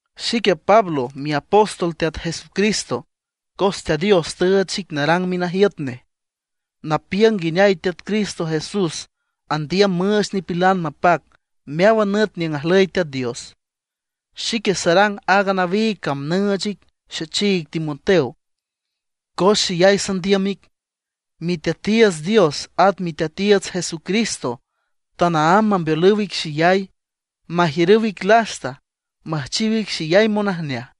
Xique Pablo, miapóstol Teat Jesucristo cos Teat Dios tüüch xic narang minajiüt nej, napiüng nguineay Teat Cristo Jesús andiüm müüch nipilan mapac meáwan nüt niüng ajlüy Teat Dios. Xique sarang aaga nawiig cam nüüch ic, xechiig Timoteo, cos xeyay sandiüm ic. Miteatiiüts Dios at Miteatiiüts Jesucristo tanaámb mambeolüw ic xeyay, majiürüw ic lasta, müjchiw ic xeyay monajneaj.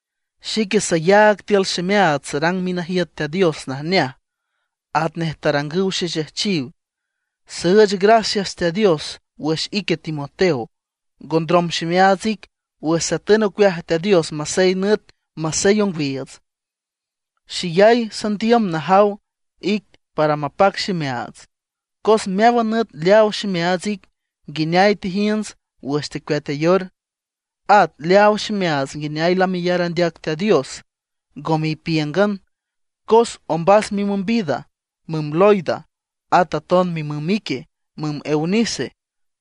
Xique sayaag tiül ximeaats sarang minajiüt Teat Dios najneaj, atnej tarangüw xexejchiw. Süüch gracias Teat Dios wüx ique Timoteo. Ngo ndrom ximeaats ic wüx satün ocueaj Teat Dios masey nüt, masey ongwiiüts. Xeyay sandiüm najaw ic para mapac ximeaats, cos meáwan nüt leaaw ximeaats ic nguineay tejiünts wüx tecueatayor. At leaaw ximeaats nguineay lameyar andeac Teat Dios, ngome ipíüngan. Cos ombas mimüm vida, müm Loida, at aton mimüm ique, müm Eunice,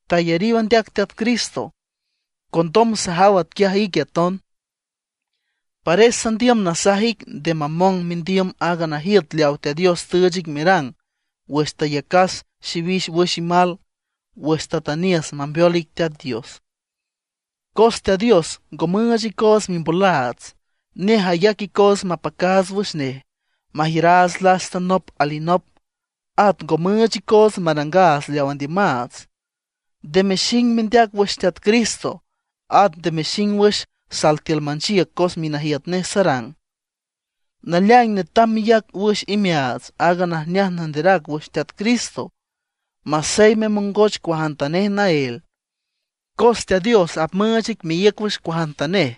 tayariw andeac Teat Cristo, condom sajaw atquiaj ique aton. Pares sandiüm nasaj ic nde mamong mendiüm aaga najiüt leawa Teat Dios tüüch ic merang wüx tayacas xiwix wüx imal, wüx tatüniüs mambeol ic Teat Dios. Cos Teat Dios ngo müüch icoots mimbolaats. Nej ayac icoots mapacaats wüx nej, majiüraats lasta nop alinop, at ngo müüch icoots marangaats leaw andiümaats. Nde mexing mendeac wüx Teat Cristo; at nde mexing wüx sal tiül manchiüc cos minajiüt nej sarang. Naleaing netam meyac wüx imeaats aaga najneaj nanderac wüx Teat Cristo masey memongoch cuajantanej naél, cos Teat Dios apmüüch ic meíüc wüx cuajantanej.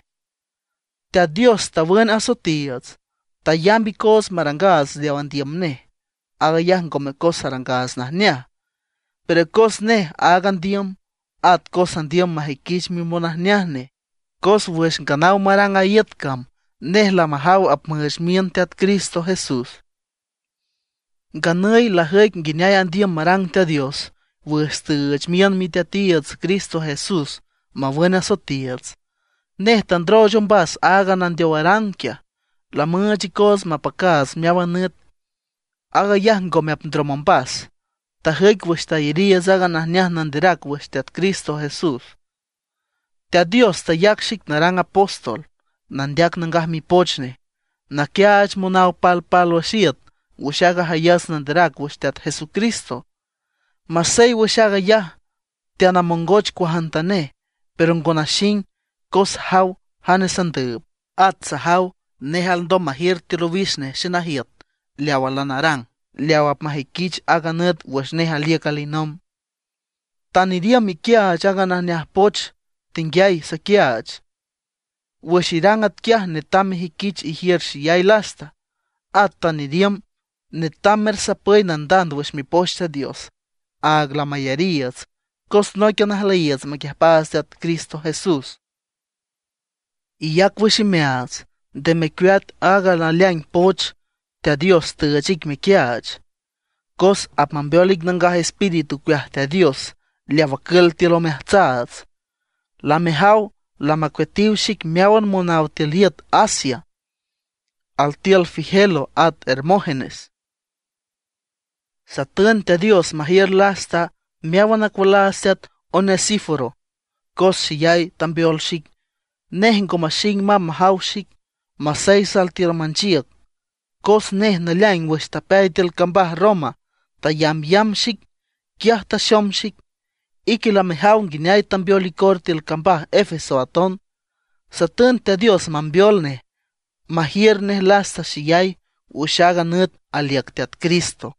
Teat Dios tawün asoetiiüts, tayamb icoots marangaats leaw andiüm nej. Aag ayaj ngome cos arangaats najneaj, pero cos nej áag andiüm; at cos andiüm majüiquich mimonajneaj nej. Cos wüx nganaw marang a iüt cam, nej lamajaw apmüüch miün Teat Cristo Jesús. Nganüy lajüic nguineay andiüm marang Teat Dios wüx tüüch miün Miteatiiüts Cristo Jesús mawün asoetiiüts. Nej tandrooch ombas aaga nandeowaran quiaj, lamüüch icoots mapacaats meáwan nüt. Aag ayaj ngome apndrom ombas, tajüic wüx tayariiüts aaga najneaj nanderac wüx Teat Cristo Jesús. Teat Dios tayac xic narang apóstol, nandeac Nangaj Mipoch Nej, naquiaach monaw palpálwüx iüt wüx aaga jayats nanderac wüx Teat Jesucristo. Masey wüx aag ayaj teanamongoch cuajantanej, pero ngo naxing, cos sajaw jane sandüüb, at sajaw nej alndom majiür tiül owix nej xenajiüt leawa lanarang, leaw apmajüiquich aaga nüt wüx nej aliüc alinomb. Tan iriümb iquiaach aaga najneaj poch tenguiay saquiaach. Wüx irang atquiaj netam mejüiquich ijiür xeyay lasta, at tan iriümb netam mersapüy nandand wüx Mipoch Teat Dios, áag lamayariiüts cos nóiquian ajlüyiiüts maquiüjpaats Teat Cristo Jesús. Iyac wüx imeaats, nde mecueat aaga naleaing poch Teat Dios tüüch ic mequiaach, cos apmambeol ic Nangaj Espíritu ocueaj Teat Dios leaw acül tiül omeajtsaats. Lamejaw lamacueatiw xic meáwan monaw tiül iüt Asia, altiül Figelo at Hermógenes. Satün Teat Dios majiür lasta meáwan acualaats teat Onesíforo, cos xeyay tambeol xic. Nej ngo maxing mamb majaw xic, masey sal tiül manchiüc. Cos nej naleaing wüx tapeay tiül cambaj Roma tayambyamb xic, quiaj taxom xic. Ique lamejaw nguineay tambeol icor tiül cambaj Efeso aton. Satün Teat Dios mambeol nej, majiür nej lasta xeyay wüx aaga nüt aliüc Teat Cristo.